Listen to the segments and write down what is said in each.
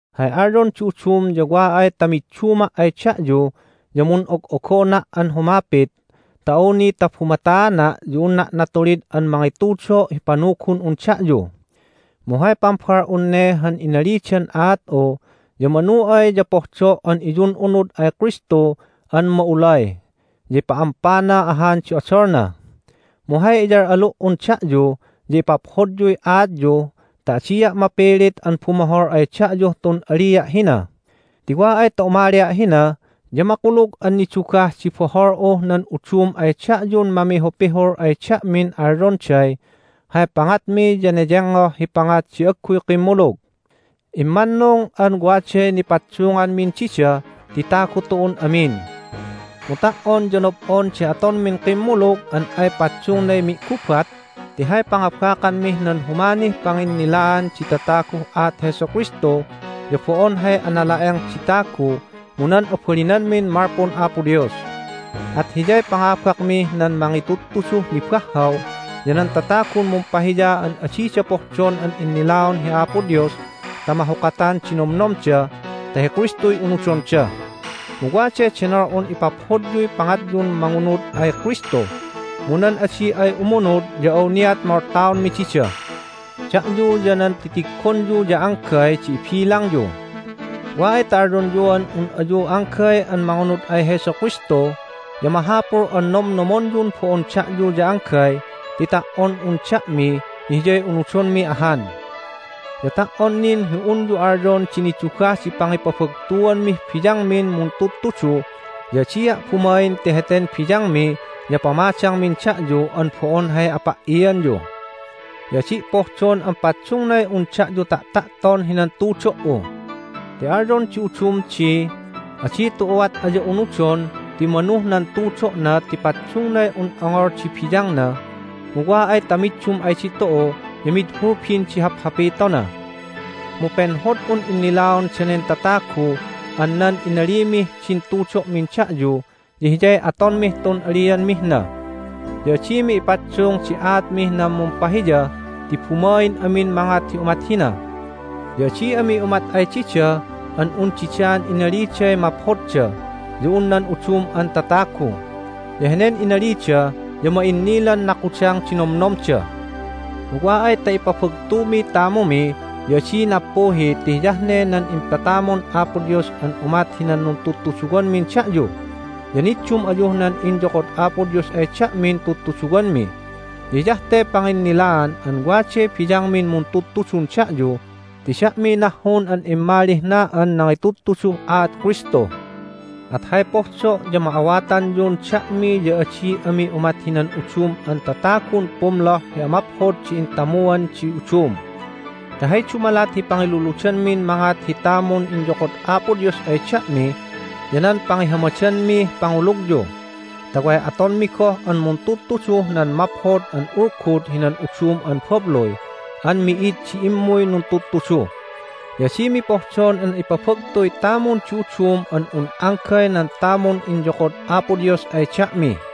Hay alyon di udum ya wa ay ta midduma' ay da'yu ya mun'og'ogona' an humapit, ta awni ta bumataana' ya unna' natulid an mangitudo' hi panugun'un da'yu. Mu hay pambal'un ne han inalidan aat'u ya manu ay ya pohdo' an iyun'unud ay Kristu an ma'ulay, ya ipa'ampana ahan di odolna. Mu hay iyal'alu"un da'yu ya ipaphodyuy aatyu ta adia' mapilit an bumohol ay da'yuh tun alia' hina. Ti wa ay ta umalia' hina ya makulug an nidugah di bohol'uh nan udum ay da'yun mamihupihul ay da'min alyonday hay pangatmi ya neyengngoh hi pangat di agguy kimmulug. Immannung an waday nipaddunganmin dida ti tagu tu'un amin. Mu ta"on ya nob'on di atonmin kimmulug an ay paddungnay mi'gubat ti hay pangabakanmih nan humanih panginnilaan di tataguh aat Jesu Kristu ya bo'on hay anala'eng di tagu mu nan abalinanmin malpun Apo Dios. At hiyay pangabakmih nan mangitudtuduh nibahhaw ya nan tatagun mumpahiya an adida pohdon an innilaon hi Apo Dios ta mahukatan di nomnomda ta hi Kristuy unudonda. Mu waday denol'un ipaphodyuy pangatyun mangunud ay Kristu, mu nan adi ay umunud ya awniat moltaonmi dida. Da'yu ya nan titiggonyu ya anggay di ibilangyu. Wa ay ta alyonyuan un ayu anggay an mangunud ay Jesu Kristu ya mahapul an nomnomonyun bo'on da'yu ya anggay ti ta"on un da'mi ya Hiyay unudonmi ahan. Ya ta"on nin hi unyu alyon di nidugah di pangipabagtuanmih biyangmin muntudtudu ya adia' bumain ti heten biyangmi ya pamadangmin da'yu an bo'on hay apa"ianyu. Ya adi' pohdon an paddungnay un da'yu ta'ta'ton hinan tutudo"u. Ti alyon di udum di, "Adi tu'uat aya unudon ti manuh nan tudo'na ti paddungnay un ongol di biyangna, mu wa ay ta middum ay ditu'u ya mid hulbin di haphapitona!" Mu penhod'un innilaon danen tatagu an nan inalimih din tudo'min da'yu ya hiyay atonmih tun alianmih na. Ya adimi ipaddung di aatmih nan mumpahiya ti bumain amin mangat hi umat hina. Ya adi ami umat ay dida an un didaan inaliday maphodda ya un nan udum an tatagu. Ya henen inalida ya ma'innilan nakudang di nomnomda. Mu wa ay ta ipabagtumiy tamumi ya adi nappuhi ti hiyah ne nan impatamun Apo Dios an umat hinan nuntudtuduwanmin da'yu. Ya niddum ayuh nan inyokod Apo Dios ay da'min tudtuduwanmi. Ya hiyah te panginnilaan an waday biyangmin muntudtudun da'yu ti da'miy nahhun an immalih na an nangitudtuduh aat Kristu. At hay pohdo' ya ma'awatanyun da'mi ya adi ami umat hinan udum an tatagun pumloh hi amaphod di intamuan di udum. Ti hay dumalat hi pangiluludanmin mangat hi tamun inyokod Apo Dios ay da'mi ya nan pangihamadanmih pangulugyu ta way atonmi goh an muntudtuduh nan Maphod an Ulgud hinan udum an babluy an mi'id di immuy nuntudtudu. Ya adimi pohdon an ipabagtuy tamun di udum an un anggay nan tamun inyokod Apo Dios ay da'mi.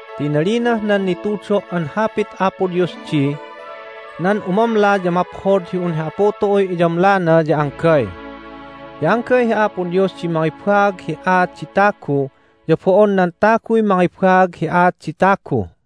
Ti inalinah nan nitudo' an Hapit Apo Dios di, "Nan umamla ya maphod hi un hi Apu tu'uy iyamlana ya anggay." Ya anggay hi Apo Dios di mangibaag hi aat di tagu ya bo'on nan taguy mangibaag hi aat di tagu.